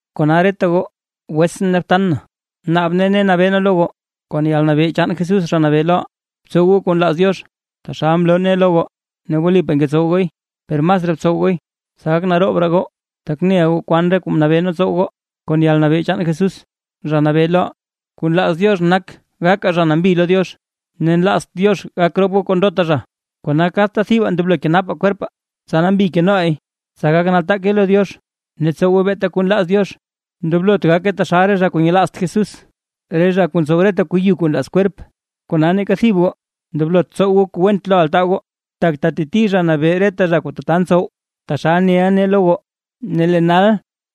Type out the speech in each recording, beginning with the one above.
Kona reta goo wetsʼn ne btan na, naab nee ne nabee nee lo goo kon yalnabee chaan Jesús Zha Nabee loʼaa: Btsow goo kuu nlaaz Diox, taxal mloo nee lo goo, ne wlipaa ngetsowa gooy per masraa btsow gooy tsa gak naroob raa goo. Tak neʼa goo kwan re kuu mnabee nee tsow goo kon yalnabee chaan Jesús, Zha Nabee loʼaa. Kuu nlaaz Diox nak gakaa zha nambi lo Diox, ne nlaazt Diox gak rop goo kon ndota zha, kona kadta thibaa ndoblo kenapaa kwerpaa, tsa nambi keno leey, tsa gak nataake lo Diox ne tsowe beeta kuu nlaaz Diox. Ndoblot gakaa taxal re zha kuu nyelaazt Jesús, re zha kuu ntsow reta kuu yu kuu nlaaz kwerp. Kona neeka thib goo ndoblot tsow goo kuu went lo altaa goo, tak teteti Zha Nabee reta zha kuu tata ntsow, taxal neʼa nee lo goo ne lee nal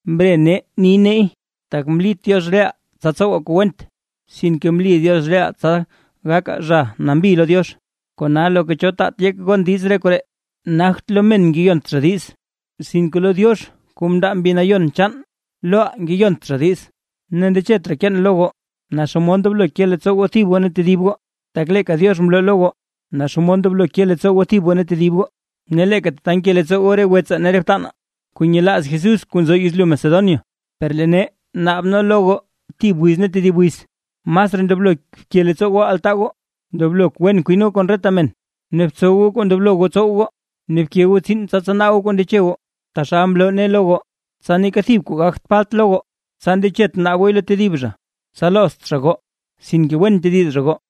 mre nee ni neey. Tak mlit Diox reʼaa tsa tsowaa kuu went, sinke mli Diox reʼaa tsa gakaa zha nambi lo Diox. Kona loka cho taat yek gon diiz re koree, nagt lo men ngeyont zha diiz, sinke lo Diox kuu mndaa Mbi Nayon chaan loʼaa ngeyont zha diiz. Ne ndechet raa keen lo goo naa xomod ndoblo ke leettsoo goo thib goo ne tedib goo, tak leeka Diox mloo lo goo naa xomod ndoblo ke leettsoo goo thib goo ne tedib goo. Ne leeka tata nke leettsoo goo re wetsaa ne re btanaa kuu nyelaaz Jesús kuu nzo yezlyu Macedonia. Per lee nee naab nee lo goo thib wiz ne tedib wiz masraa ndoblo bke leettsoo altaa goo. Ndoblo wen kwin goo kon reta men, ne btsow goo kuu ndoblo goo tsow goo, ne bke goo tsiin tsa tsanaa goo kuu ndeche goo taxal mloo nee lo goo. Tsa neeka thib kwaa gagt falt lo goo, tsa ndechet naab gooy lo tedib zha ne tsa loozt zha goo sinke wen tediz zha goo.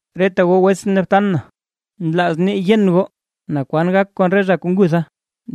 Reta goo wetsʼn ne btan na, nlaaz nee yen goo naa kwan gak kon re zha kuu ngutha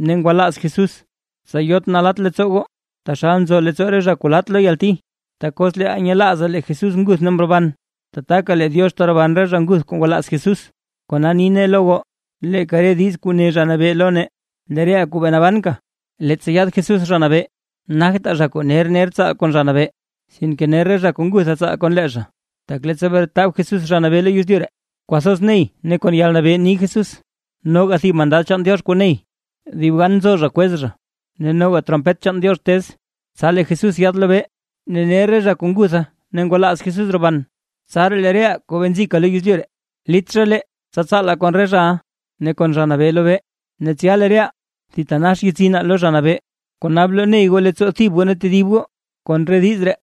ne ngwalaaz Jesús, tsa yot nalatt leettsoo goo, taxal nzo leettsoo re zha kuu laat lo yalti. Tak os leeʼaa nyelaazaa lee Jesús nguth ne mroban, tataka lee Diox teroban re zha nguth kuu ngwalaaz Jesús. Kona ni nee lo goo leeka re diiz kuu ne Zha Nabee lo nee, lee reʼaa kuu bee nabanka leettsa yaad Jesús Zha Nabee, nagtaa zha kuu ner ner tsaal kon Zha Nabee, sinke ner re zha kuu ngutha tsaal kon lee zha. Tak leettsa bretab Jesús Zha Nabee lo yezlyu ree, kwathoz ney ne kon yalnabee ni Jesús, noga thib mandad chaan Diox kuu ney, dib gan nzo zha kwez zha, ne noga trompet chaan Diox tez, tsa lee Jesús yaad lobee, ne ner re zha kuu ngutha ne ngwalaaz Jesús roban. Tsaraa lee reʼaa kuu bee nzika lo yezlyu ree lit zha lee tsa tsaalaa kon re zhaʼa ne kon Zha Nabee lobee, ne tsya lee reʼaa thitanax yetsinaa lo Zha Nabee. Kona bloney goo leettsoo thib goo ne tedib goo kon re diiz ree.